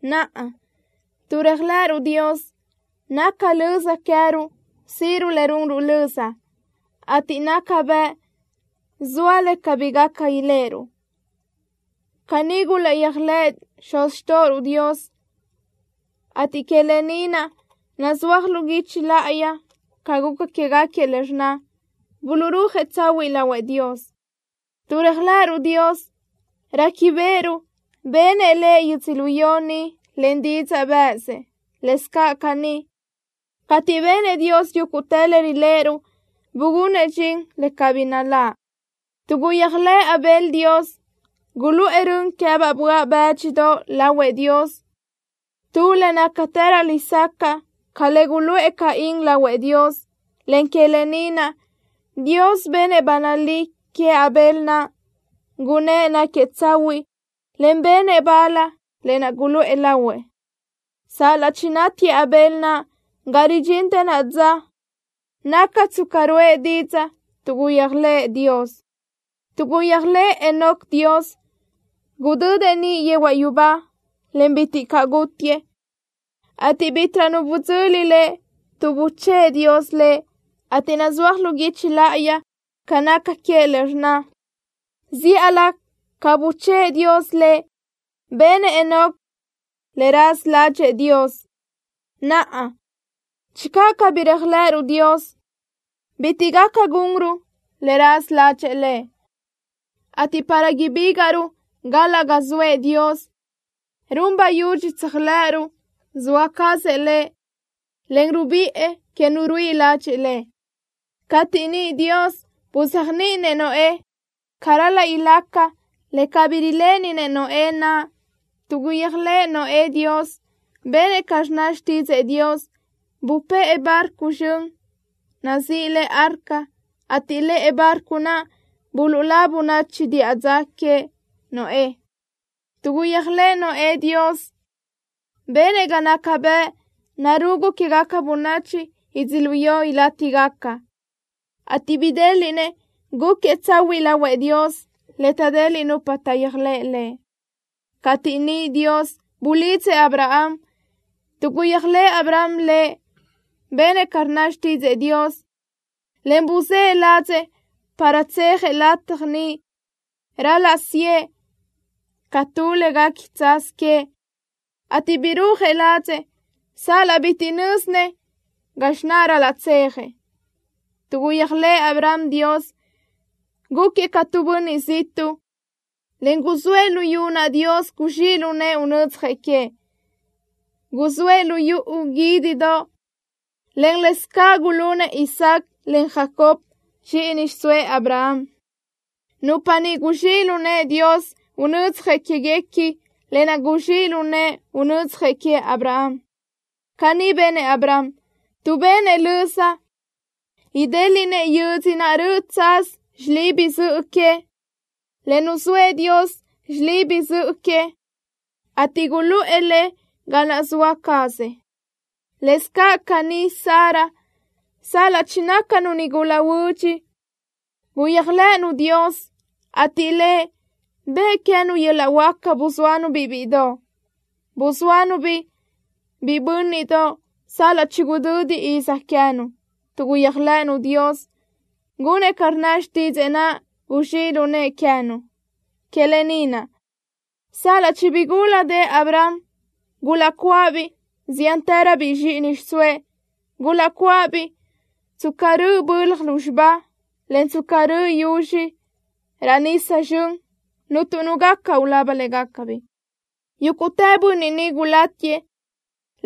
Naʼa, tuʼ réajlëʼëruʼ Dios, naca löza queë́ruʼ síʼiruʼ le runruʼ löza, ateʼ naca bëʼ zoa le cabí gaca iléʼeruʼ. Caní gulaʼyéajlëʼë xuz xtóʼoruʼ Dios, ateʼ que lë ni naʼ nazúaj lu guichi láʼayi ca guca quégaquiëʼ le rnna: Buluʼrúajëʼ tsahuiʼ lahuëʼ Dios. Tuʼ réajlëʼëruʼ Dios, réquibeʼeruʼ benëʼ Lëʼ yödzölió ni len didzaʼ bë́ʼësëʼ. Lëscaʼ caní, cateʼ benëʼ Dios yúguʼtë le riléʼeruʼ, bugunëʼ dxin le cabí naláʼ. Tuʼ guyéajlëʼë Abel Dios, guluʼë rön queë́baʼ böaʼ bë́dxidoʼ lahuëʼ Dios, tu le nácatërö lesacaʼ ca le guluʼë Caín lahuëʼ Dios, en que lë ni naʼ Dios benëʼ ba nalí queëʼ Abel naʼ, gunnë́ʼ náquiëʼ tsahuiʼ, en benëʼ bal lë naʼ guluʼë lahuëʼ. Sal-laʼ chinátiëʼ Abel naʼ, ga ridxintë naʼa dza, naca tsca ruʼë didzaʼ, tuʼ guyéajlëʼë Dios. Tuʼ guyéajlëʼë Enoc Dios, gudödëʼ niʼ yehuaʼ yubá, en bitiʼ caʼ gútiëʼ, ateʼ bítiʼrö nu budzöli lëʼ, tuʼ buchë́ʼë Dios lëʼ, ateʼ nazúaj lu guichi láʼayi ca naca queëʼ le rnna: “Zíʼalö ca buchë́ʼë Dios lëʼ, benëʼ Enoc le raza ládxëʼë Dios.” Naʼa, channö cabí réajlëʼëruʼ Dios, bitiʼ gaca gunruʼ le raza ládxëʼë Lëʼ, ateʼ para ibígaʼruʼ galaʼ ga zoëʼ Dios, run bayudxi tséajlëʼëruʼ zoa cazëʼ Lëʼ, en rubiʼë que nu ruíʼi ladxiʼ Lëʼ. Cateʼ niʼ Dios buzéajniʼinëʼ Noé ca ral-laʼ ilaca le cabí riléʼeninëʼ Noé naʼ, tuʼ guyéajlëʼë Noé Dios, benëʼ ca rnna xtídzëʼë Dios. Bupë́ʼë barco zxön naʼ nazíʼi le Arca, ateʼ lëʼe barco naʼ buluʼlá bönachi diʼa dza queëʼ Noé. Tuʼ guyéajlëʼë Noé Dios, benëʼ ga naca bëʼ narugu quégaca bönachi yödzölió ilátigaca, ateʼ bidéliʼnëʼ gúquiëʼ tsahuiʼ lahuëʼ Dios, le taʼdeliʼ nupa taʼyéajlëʼ Lëʼ. Cateʼ niʼ Dios bulidzëʼ Abraham, tuʼ guyéajlëʼë Abraham Lëʼ, benëʼ ca rnna xtídzëʼë Dios, en buzë́ʼë ladzëʼ para tsejëʼ lataj niʼ ral-laʼ siʼë ca tu le guequi tsaz queëʼ, ateʼ birúajëʼ ladzëʼ sal-laʼ bitiʼ nö́zinëʼ gazxi naʼ ral-laʼ tsejëʼ. Tuʼ guyéajlëʼë Abraham Dios, gúquiëʼ ca tu bönniʼ ziʼtuʼ, en guzóëʼ luyú naʼ Dios guzxíʼ lu nëʼë unödzjëʼ queëʼ. Guzóëʼ lu yuʼu guídidoʼ, en lë́bisö ca gulunëʼ Isaac, en Jacob, zxíʼini xiʼsóëʼ Abraham, nupa niʼ guzxíʼ lu nëʼë Dios unödzjëʼ quéguequi lë naʼ guzxíʼ lu nëʼë unödzjëʼ queëʼ Abraham. Caní benëʼ Abraham, tuʼ benëʼ löza idéliʼnëʼ yödzö naʼ röʼö tsaz xilibi zöʼö que, le nuzóëʼ Dios xilibi zöʼö que, ateʼ guluʼë le ga naʼ zoëʼ Lë cazëʼ. Lëscaʼ caní Sara, sal-laʼ chinácanu nigula huödx, guyéajlëʼënu Dios, ateʼ Lëʼ bëʼë queë́nu yöl-laʼ huáca buzóanu-biʼ bíʼidoʼ. Buzóanu-biʼ biʼi bö́nniʼdoʼ sal-laʼ chigudödi izi queë́nu, tuʼ guyéajlëʼënu Dios gunëʼ ca rnna xtídzëʼë naʼ guzxíʼ lu nëʼë queë́nu. Que lë ni naʼ, sal-laʼ chibigúladëʼë Abraham, gulaʼcuáʼabiʼ ziántëröbiʼ zxíʼini xiʼsóëʼ. Gulaʼcuáʼabiʼ tsca rö́ʼöbaʼ bölaj lúzxiba, en tsca röʼö yuzxi tu raʼ nisa zxön, cuntu nu gaca ulaba légacabiʼ. Yúguʼtë bönniʼ ni gulátiëʼ,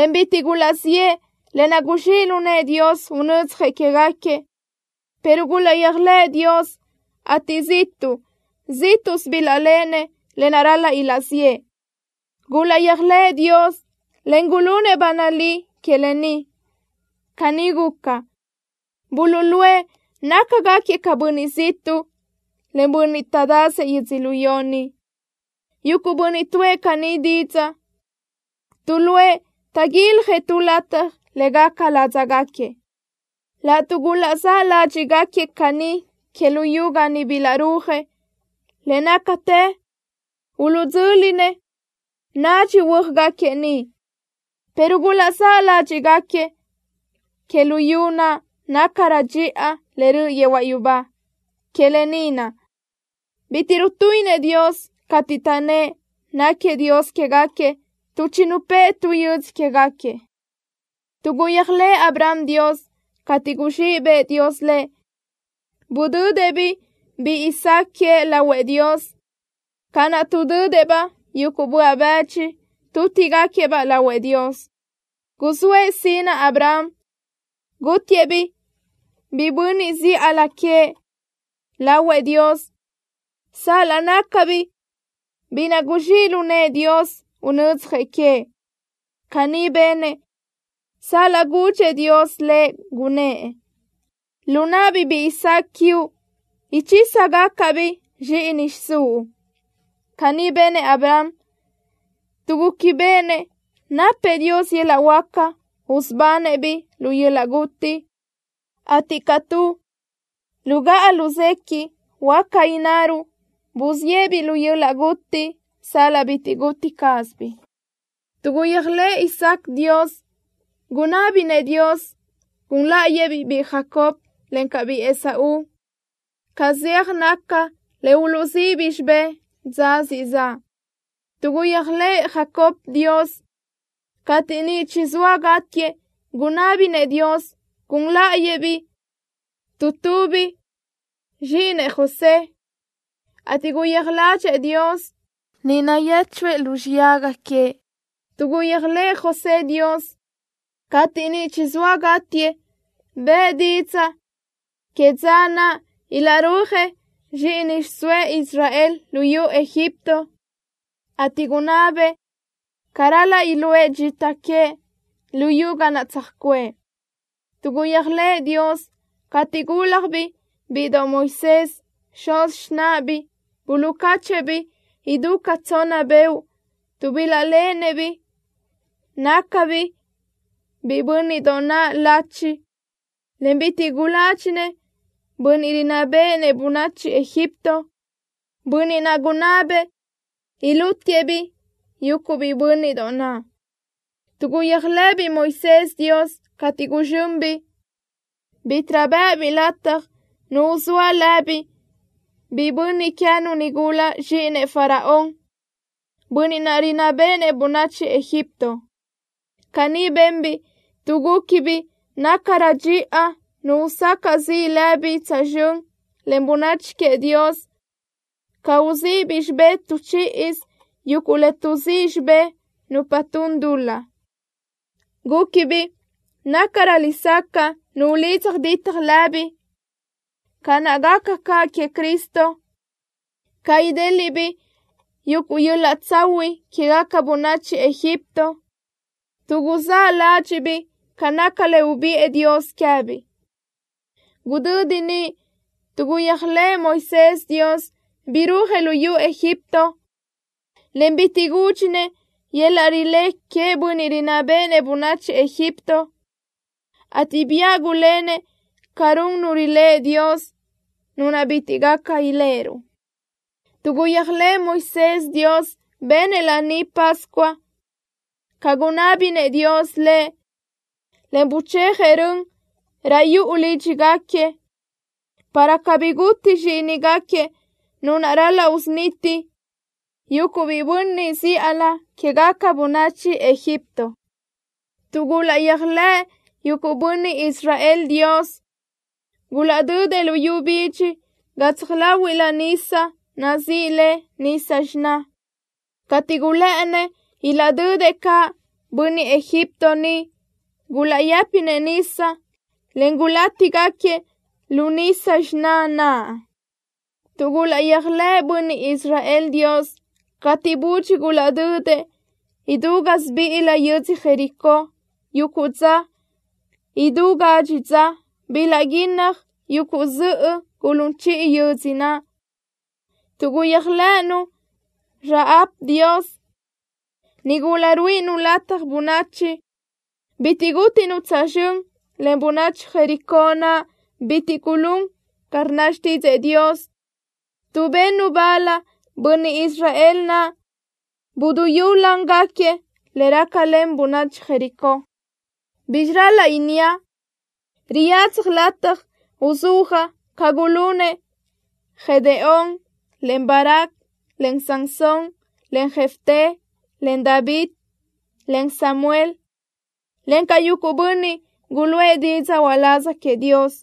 en bitiʼ gulaʼziʼë lë naʼ guzxíʼ lu nëʼë Dios unödzjëʼ quégaquiëʼ, pero gulaʼyéajlëʼë Dios, ateʼ ziʼtuʼ zíʼtuʼsö bilaʼléʼenëʼ lë naʼ ral-laʼ ilaʼziʼë. Gulaʼyéajlëʼë Dios, en gulunëʼ ba nalí que lë ni. Caní guca, buluʼluʼë nácagaquiëʼ ca bönniʼ ziʼtuʼ, en bönniʼ taʼdazëʼ yödzölió ni. Yuguʼ bönniʼ tuʼë caní didzaʼ, tuʼluʼë taʼguiljëʼ tu lataj le gaca ládzagaquiëʼ. Laʼtuʼ gulaʼzáʼ ládxiʼgaquiëʼ caní que luyú ga niʼ bilaʼrúajëʼ, le nácatë uluʼdzö́linëʼ nacxi huö́ajgaquiëʼ niʼ, pero gulaʼzáʼ ládxiʼgaquiëʼ que luyú naʼ nácarö dxiʼa, le röʼ yehuaʼ yubá. Que lë ni naʼ bitiʼ rutuíʼinëʼ Dios cateʼ taʼnnë́ʼ náquiëʼ Dios quégaquiëʼ, tuʼ chinupë́ʼë tu yödzö quégaquiëʼ. Tuʼ guyéajlëʼë Abraham Dios, cateʼ guzxíʼ bëʼë Dios lëʼ, budödëʼ-biʼ biʼi Isaac queëʼ lahuëʼ Dios ca naʼ tuʼdödëʼ-baʼ yuguʼ böaʼ bëdxi tútigaquiëʼ-baʼ lahuëʼ Dios. Guzóëʼ sinaʼ Abraham gútiëʼ-biʼ biʼi bönniʼ zíʼalö queëʼ naʼ lahuëʼ Dios sal-laʼ nácabiʼ biʼi naʼ guzxíʼ lu nëʼë Dios unödzjëʼ queëʼ. Caní benëʼ sal-laʼ gudxëʼ Dios lëʼ, gunnë́ʼ: “Lu náʼabiʼ biʼi Isaac quiuʼ ichísagacaʼ-biʼ zxíʼini xiʼsúʼ.” Caní benëʼ Abraham, tuʼ gúquibeʼenëʼ napëʼ Dios yöl-laʼ huáca usubanëʼ-biʼ lu yöl-laʼ guti, ateʼ ca tu lugáʼa luséquiʼ, huáca innaruʼ buziʼë-biʼ lu yöl-laʼ guti sal-laʼ bitiʼ guti cázabiʼ. Tuʼ guyéajlëʼë Isaac Dios, gunábinëʼ Dios gun láʼayëʼ-biʼ biʼi Jacob, encaʼ biʼi Esaú ca zeaj naca le uluʼzíʼibiʼ xibé dza siʼ zaʼ. Tuʼ guyéajlëʼë Jacob Dios, cateʼ niʼ chizóa gátiëʼ gunábinëʼ Dios gun láʼayëʼ-biʼ tu tubiʼ zxíʼinëʼ José, ateʼ guyéaj ládxëʼë Dios, niʼ nayéchuëʼ lu xiyaga queëʼ. Tuʼ guyéajlëʼë José Dios, cateʼ niʼ chizóa gátiëʼ, bëʼë didzaʼ que dza naʼ ilaʼrúajëʼ zxíʼini xiʼsóëʼ Israel luyú Egipto, ateʼ gunná bëʼë ca ral-laʼ iluʼë dxita queëʼ luyú ga naʼ tsöjcuʼë. Tuʼ gulaʼyéajlëʼë Dios, cateʼ gúljabiʼ bíʼidoʼ Moisés, xuz xináʼabiʼ buluʼcáchëʼë-biʼ idú ca tsonna beoʼ, tuʼ bilaʼléʼenëʼ nácabiʼ biʼi bö́nniʼdoʼ naʼ lachi, en bitiʼ guládxinëʼ bönniʼ rinná béʼenëʼ bönachi Egipto, bönniʼ naʼ gunná bëʼë ilútiëʼ-biʼ yuguʼ biʼi bö́nniʼdoʼ naʼ. Tuʼ guyéajlëʼëbiʼ Moisés Dios, cateʼ guzxönbiʼ, bítiʼrö bë́ʼëbiʼ lataj nu uzóa lëbiʼ biʼi bönniʼ queë́nu nigula zxíʼinëʼ Faraón, bönniʼ naʼ rinná béʼenëʼ bönachi Egipto. Caní benbiʼ tuʼ gúquibiʼ nácarö dxiʼa nu usacaʼ ziʼ lëbiʼ tsözxö́n len bönachi queëʼ Dios ca uzíʼibiʼ xibé tu chíʼisö yuguʼ le tuʼzíʼ xibé nupa tun dul-laʼ. Gúquibiʼ nácarö lesacaʼ nu ulidza ditaj lëbiʼ, ca naʼ gaca caʼ queëʼ Cristo, ca idéliʼbiʼ yuguʼ yöl-laʼ tsahuiʼ quégaca bönachi Egipto, tuʼ guzáʼ ládxiʼbiʼ ca naca le ubiʼë Dios queë́biʼ. Gudödi niʼ, tuʼ guyéajlëʼë Moisés Dios, birúajëʼ luyú Egipto, en bitiʼ gúdxinëʼ yöl-laʼ rilé queëʼ bönniʼ rinná béʼenëʼ bönachi Egipto, ateʼ biáʼ gulénëʼ ca run nu riléʼe Dios, Nu naʼ bitiʼ gaca iléʼeruʼ. Tuʼ guyéajlëʼë Moisés Dios, benëʼ Laní Pascua ca gunná béʼenëʼ Dios lëʼ, en buchéajëʼ rön raʼ yuʼu lídxigaquiëʼ, para cabí guti zxíʼinigaquiëʼ nu naʼ ral-laʼ usuniti yuguʼ biʼi bönniʼ zíʼalö quégaca bönachi Egipto. Tuʼ gulaʼyéajlëʼë yuguʼ bönniʼ Israel Dios, gulaʼdödëʼ luyú bidxi gatsaj láhuiʼlö nísadoʼ nazíʼi le Nisa Xiná. Cateʼ gulë́ʼënnëʼ ilaʼdödëʼ caʼ bönniʼ Egipto niʼ, gulaʼyë́pinëʼ nisa, en gulátigaquiëʼ lu Nisa Xiná naʼ. Tuʼ gulaʼyéajlëʼë bönniʼ Israel Dios, cateʼ budxi gulaʼdödëʼ idú gásibiʼilö yödzö Jericó yuguʼ dza idú gadxi dza, bilaʼguínnaj yuguʼ zöʼö gulún chiʼi yödzö naʼ. Tuʼ guyéajlëʼënu Rahab Dios, nigula ruíʼinu lataj bönachi, bitiʼ gútinu tsözxö́n len bönachi Jericó naʼ bitiʼ gulún ca rnna xtídzëʼë Dios, tuʼ bennu bal bönniʼ Israel naʼ buduyúlangaquiëʼ le rácalen bönachi Jericó. ¿Bízxirö ral-laʼ inníaʼ? Riyadzaj lataj uzúajaʼ ca gulunëʼ Gedeón, en Barac, en Sansón, en Jefté, en David, en Samuel, encaʼ yuguʼ bönniʼ guluʼë didzaʼ uláz queëʼ Dios.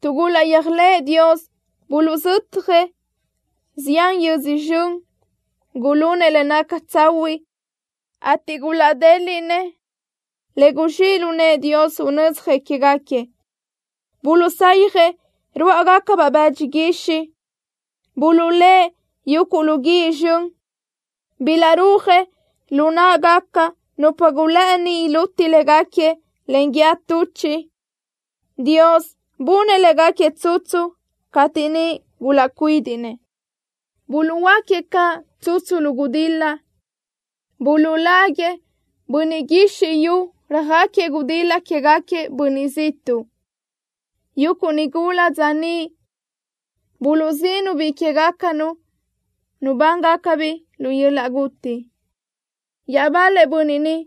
Tuʼ gulaʼyéajlëʼë Dios, buluʼzötjëʼ zián yödzö zxön. Gulunëʼ le naca tsahuiʼ, ateʼ gulaʼdéliʼnëʼ le guzxíʼ lu nëʼë Dios unödzjëʼ quégaquiëʼ. Buluʼsayjëʼ ruáʼagacabaʼ bëdxi guixiʼ. Buluʼlë́ʼ yuguʼ lu guíʼ zxön. Bilaʼrúajëʼ lu náʼagaca nupa gulë́ʼëni iluti légaquiëʼ len guíë tuchiʼ. Dios bunëʼ légaquiëʼ tsutsu cateʼ niʼ gulaʼcuídiʼnëʼ. Buluʼhuöáquiëʼ caʼ tsutsu lu gudil-la. Buluʼláguiëʼ bönniʼ guizxi yu röjáquiëʼ gudil-la quégaquiëʼ bönniʼ ziʼtuʼ. Yuguʼ nigula dza niʼ buluʼzíʼinu biʼi que queë́gacanu nubángacabiʼ lu yöl-laʼ guti. Iaʼbal-lëʼ bönniʼ niʼ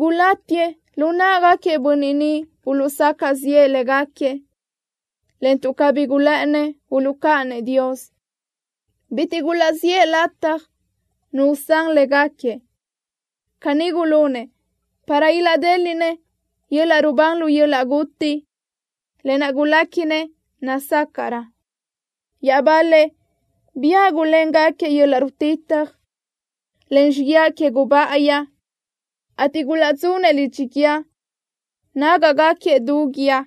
gulátiëʼ lu náʼagaquiëʼ bönniʼ niʼ buluʼsacaʼ ziʼë légaquiëʼ, en tuʼ cabí gulë́ʼënnëʼ uluʼcáʼanëʼ Dios, bitiʼ gulaʼziʼë lataj nu usán légaquiëʼ. Caní gulunëʼ para ilaʼdéliʼnëʼ yöl-laʼ rubán lu yöl-laʼ guti, lë naʼ guléquinëʼ nazácaʼrö. Iaʼbal-lëʼ biáʼ guléngaquiëʼ yöl-laʼ rutitaj, en xíguiaʼ que gubáʼayi, ateʼ gulaʼdzunëʼ lidxi guíë, nágaʼgaquiëʼ du guíë.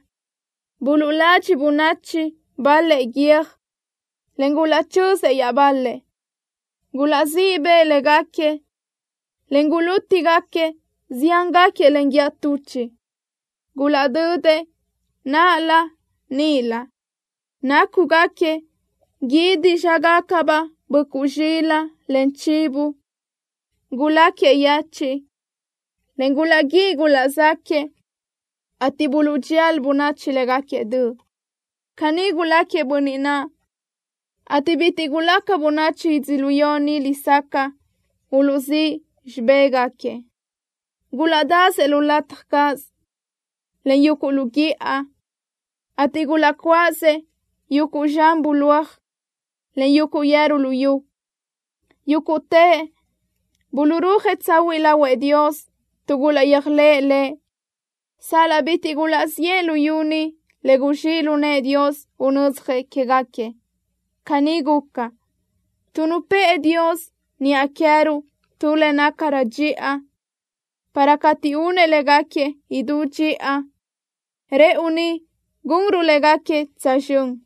Buluʼladxiʼ bönachi bal-lëʼ guiö́j, en gulaʼchözëʼ iaʼbal-lëʼ. Gulaʼzíʼ bëʼë légaquiëʼ, en gulútigaca ziángaquiëʼ len guíë tuchiʼ. Gulaʼdödëʼ náʼalö níʼilö, nácugaquiëʼ guídi zxágacabaʼ böʼcuʼ zxilaʼ, en chivo. Guláquiëʼ yechiʼ, en gulaʼguíʼi gulaʼzáquëʼë, ateʼ buluʼdxía bönachi légaquiëʼ döʼ. Caní guláquiëʼ bönniʼ naʼ, ateʼ bitiʼ gulaca bönachi yödzölió ni lesacaʼ uluʼzíʼ xibégaquiëʼ. Gulaʼdasëʼ lu lataj cáʼasö, en yuguʼ lu guíʼa, ateʼ gulaʼcuáʼasëʼ yuguʼ zxan bulóaj, en yuguʼ yeru luyú. Yúguʼtëʼ buluʼrúajëʼ tsahuiʼ lahuëʼ Dios tuʼ gulaʼyéajlëʼë Lëʼ, sal-laʼ bitiʼ gulaʼziʼë luyú ni le guzxíʼ lu nëʼë Dios unödzjëʼ quégaquiëʼ. Caní guca, tuʼ nupë́ʼë Dios niʼa queë́ruʼ tu le nácarö dxiʼa para cateʼ únëʼ légaquiëʼ idú dxiʼa, rëʼu ni gunruʼ légaquiëʼ tsözxö́n.